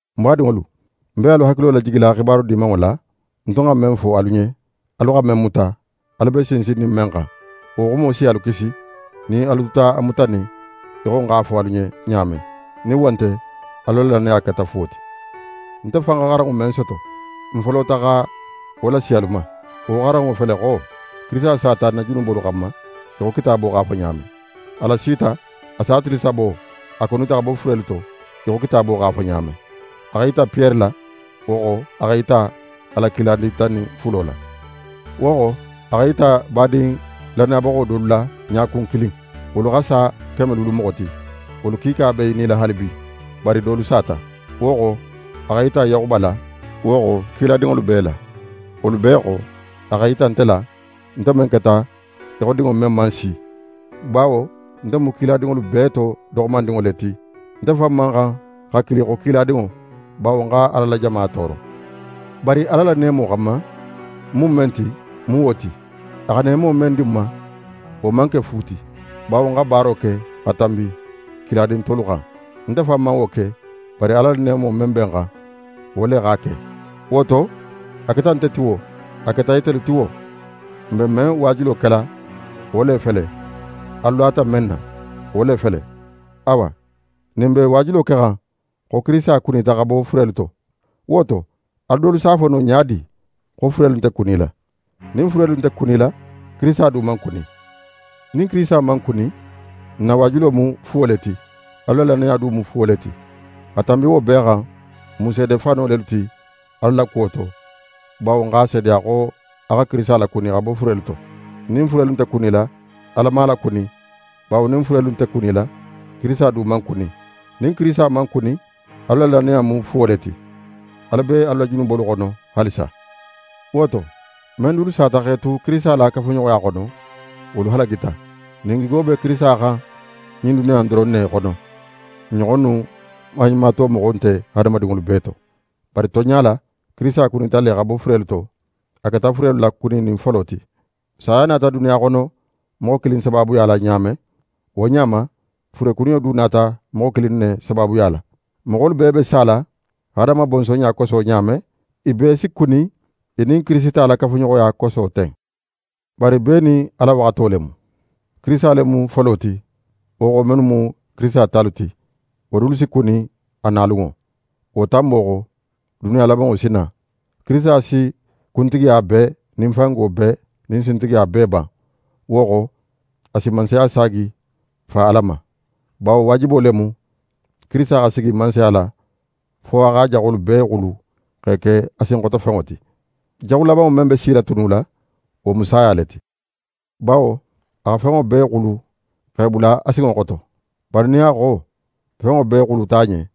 Ń badinŋolu, ń be alu hakilo lajigila xibaru Dimanŋo la, ń tun xa men fo alu ɲen, alu xa men muta, alu be sinsinnin men xan. Wo xumo si alu kisi, nin alu tuta a mutanin í xo ń x'a fo alu ɲen ɲa men. Nin wo nte, alu la lannaya keta fuwo ti. Nte fan xa xaranŋo men soto, ń folota xa wo lasi alu ma. Wo xaranŋo fele xo: Kirisita sata n na junubolu xanma, í xo Kitaabo x'a fo ɲa men. A lasita, a sa tili sabo, a kunita xa bo furelu to, í xo Kitaabo x'a fo ɲa men. A x'é yita Piyere la, wo xo, a x'é yita a la kiladin tan nin fulo la. Wo xo, a x'é yita badin lannayabaxo dolu la ɲakun kilin, wolu xa sa keme luulu moxo ti. Wolu kiika be i nila haalibi, bari dolu sata. Wo xo, a x'é yita Yaxuba la, wo xo, kiladinŋolu bee la. Wolu bee xo, a x'é yita nte la, nte men keta í xo dinŋo men man si. Bawo nte mu kiladinŋolu bee to doxomandinŋo le ti. Nte fan man xan xa kili xo kiladinŋo; bawo ń xa Ala la jama tooro. Bari Ala la neemo xanma, ń mu men ti, ń mu wo ti. A xa neemo men di ń ma, wo man ke fu ti, bawo ń xa baaro ke xa tanbi kiladin tolu xan. Nte fan man wo ke; bari Ala la neemo men be ń xan, wo le x'a ke. Wo to, a keta nte ti wo, a keta itelu ti wo, n be men waajulo kela wo le fele, alu lata men na, wo le fele. Awa, nin n be waajulo kexan xo Kirisita kunita xa bo furelu to, wo to, alu dolu si a fo ɲa di xo furelu nte kunila? Nin furelu nte kunila, Kirisita du man kuni. Nin Kirisita man kuni, n na waajulo mu fuwo le ti; alu la lannaya du mu fuwo le ti. Xa tanbi wo bee xan, n mu seede fano lelu ti Ala la kuwo to, bawo n x'a seedeya xo a xa Kirisita lakuni xa bo furelu to. Nin furelu nte kunila, Ala man a lakuni. Bawo nin furelu nte kunila, Kirisita du man kuni. Nin Kirisita man kuni, alu la lannaya mu fuwo le ti. Alu be alu la junubolu xono haalisa. Wo to, men dulu sata x'e tu Kirisita la kafuɲoxoya xono, wolu halagita. Nin n gigo be Kirisita xan ɲin duniya in doron ne xono, n ɲoxonnu maɲumatomoxo nte hadamadinŋolu bee to. Bari tonɲa la, Kirisita kunita le xa bo furelu to; a keta furelu la kuninin folo ti. Saya nata duniya xono moxo kilin sabaabuya la ɲa men, wo ɲa ma, furekuniyo du nata moxo kilin ne sabaabuya la. Moxolu bee be sala Adama bonsonɲa koso ɲa men, i bee si kuni i nin Kirisita la kafuɲoxoya koso ten. Bari bee nin a la waxato le mu. Kirisita le mu folo ti; wo xo, mennu mu Kirisita talu ti, wo dulu si kuni a na lunŋo. Wo tanbo xo, duniya labanŋo si na. Kirisita si kuntigiya bee nin fango bee nin sintigiya bee ban; wo xo, a si mansaya saagi Fa Ala ma. Bawo waajibo le mu Kirisita xa sigi mansaya la fo a x'a jaxolu bee xulu x'e ke a sinxotofenŋo ti. Jaxu labanŋo men be silatunula, wo mu saya le ti. Bawo a xa fenŋo bee xulu x'e bula a sinŋo xoto. Bari nin a xo: “Fenŋo bee” xuluta a ɲen,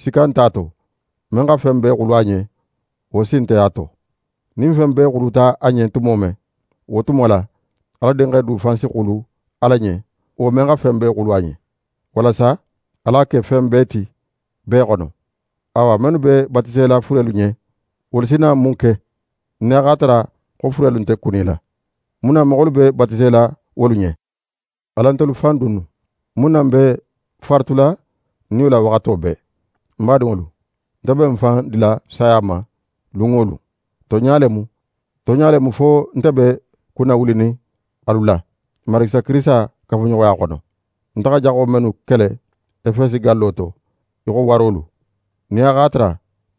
sikka nte a to, men xa fen bee xulu a ɲen, wo sin nte a to. Nin fen bee xuluta a ɲen tumo men, wo tumo la, Ala Dinxe du fan si xulu Ala ɲen, wo men xa fen bee xulu a ɲen; walasa Ala xa ke fen bee ti, bee xono. Awa, mennu be batisela furelu ɲen, wolu si na mun ke? Nin a x'a tara xo furelu nte kunila, mun na moxolu be batisela wolu ɲen? Alan ntelu fan dunnu? Mun na n be faaratula n niyo la waxato bee? Ń badinŋolu, nte be ń fan dila saya ma lun wo lun. Tonɲa le mu, tonɲa le mu fo nte be kunnawulinin alu la, n Marigi Isa Kirisita la kafuɲoxoya xono. Nte xa jaxo mennu kele Efesi gallo to í xo warolu, nin a x'a tara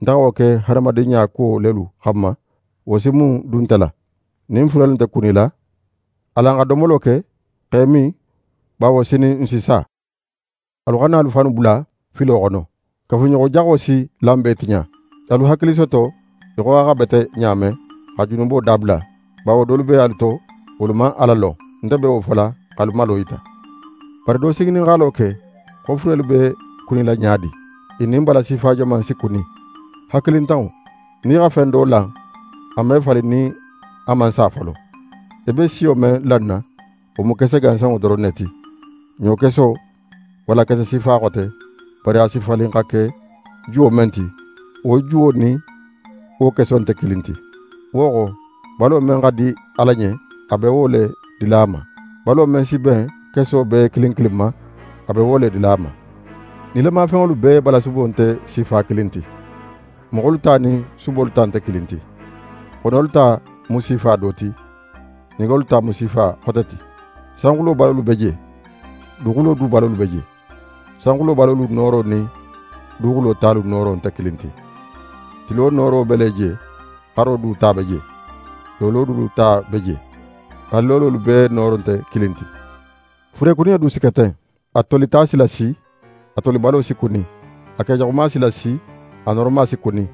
nte xa wo ke hadamadinɲa kuwo lelu xanma, wo si mun dun nte la? Nin furelu nte kunila, «alan xa domolo ke x'e min, bawo sinin n si sa.» Alu xana alu fannu bula filo xono. «Kafuɲoxojaxo si lanbe tiɲa.» Alu hakili soto í xo a xa bete ɲa men, xa junubo dabula; bawo dolu be alu to, wolu man Ala lon. Nte be wo fola, x'alu malo yita. Bari do si ŋininxalo ke xo furelu be kunila ɲa di? I nin bala sifa joman si kuni? Hakilintanŋo! Nin í xa fen do lan, a me falin nin a man sa folo. Í be siyo men lanna, wo mu kese gansanŋo doron ne ti, ɲokeso walla kese sifa xote, bari a si falin xa ke juwo men ti, wo juwo nin wo keso nte kilin ti. Wo xo, balo men xa di Ala ɲen, a be wo le dila a ma. Balo men si ben keso bee kilin kilin ma, a be wo le dila a ma. Nilamafenŋolu bee balasubo nte sifa kilin ti. Moxolu ta nin subolu ta nte kilin ti. Xonolu ta mu sifa do ti, ɲegolu ta mu sifa xote ti. Sanxulo balolu be je, duguxulo du balolu be je. Sanxulo balolu nooro nin duguxulo talu nooro nte kilin ti. Tilo nooro be le je, xaro du ta be je, loolo dulu ta be je. Haali loololu bee nooro nte kilin ti. Furekuniyo du si ke ten; a tolita si lasi, a tolibalo si kuni. A kejaxuma si lasi, a nooroma si kuni.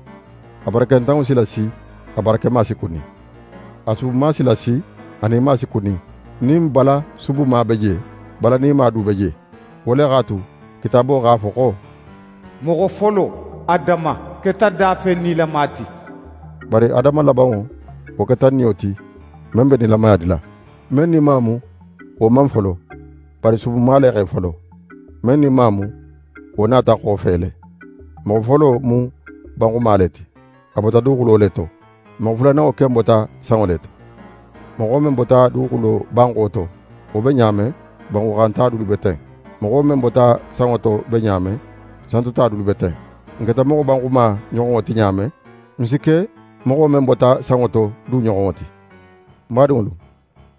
A barakentanŋo si lasi, a barakema si kuni. A subuma si lasi, a nima si kuni. Nin bala subuma be je, bala nima du be je. Wo le x'a tu, Kitaabo x'a fo xo: «Moxo folo, Adama, keta dafen nilama ti.» Bari Adama labanŋo, wo keta niyo ti, men be nilamaya dila. Men nima mu, wo man folo; bari subuma le x'é folo. Men nima mu, wo nata xofe le. Moxo folo mu banxuma le ti, a bota duguxulo le to. Moxo fulananŋo ken bota sanŋo le to. Moxo men bota duguxulo banxo to, wo be ɲa men, banxuxanta dulu be ten. Moxo men bota sanŋo to be ɲa men, santota dulu be ten. N keta moxo banxuma ɲoxonŋo ti ɲa men, n si ke moxo men bota sanŋo to du ɲoxonŋo ti. Ń badinŋolu,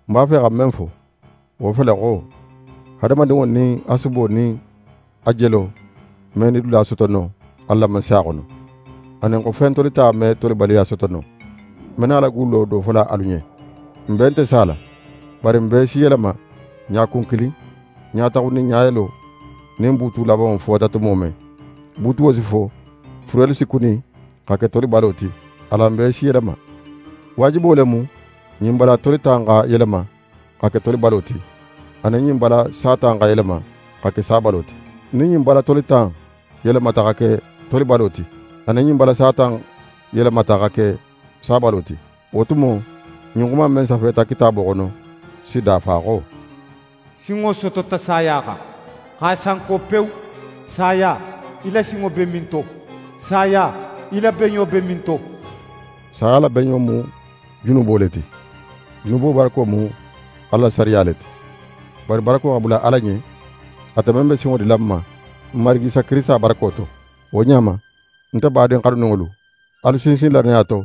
ń b'a fe xa men fo, wo fele xo: Hadamadinŋo nin a subo nin a jelo me nidula soto no Ala la Mansaya xono, anin, xo fen tolita me tolibaliya soto no. Ń be nala gullo do fola alu ɲen: N bee nte sala, bari n bee si yelema ɲakun kilin, ɲa taxun nin ɲa yelo, nin buutu labanŋo fota tumo men. Buutuwo si fo, furelu si kuni xa ke tolibalo ti; alan bee si yelema. Waajibo le mu ɲin bala tolita in xa yelema xa ke tolibalo ti, anin ɲin bala sata in xa yelema xa ke sabalo ti. Nin ɲin bala tolita in yelemata xa ke tolibalo ti, anin nin ɲin bala sata in yelemata xa ke sabalo ti, wo tumo, ɲin xuma in men safeta Kitaabo xono, si dafa xo: «Sinŋo sotota saya xan, x'a sanko pewu!» «Saya, í la sinŋo be minto? Saya, í la beɲo be minto?» Saya la beɲo mu junubo le ti; junubo barako mu Ala la sariya le ti. Bari barako xa bula Ala ɲen, ate men be sinŋo dila n ma, n Marigi Isa Kirisita barako to! Wo ɲa ma, nte badin xanuninŋolu, alu sinsin lannaya to,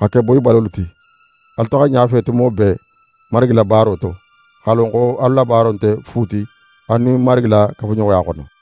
xa ke boyibalolu ti. Alu taxa ɲafe tumo bee Marigi la baaro to; x'a lon xo alu la baaro nte fu ti alu nin Marigi la kafuɲoxoya xono.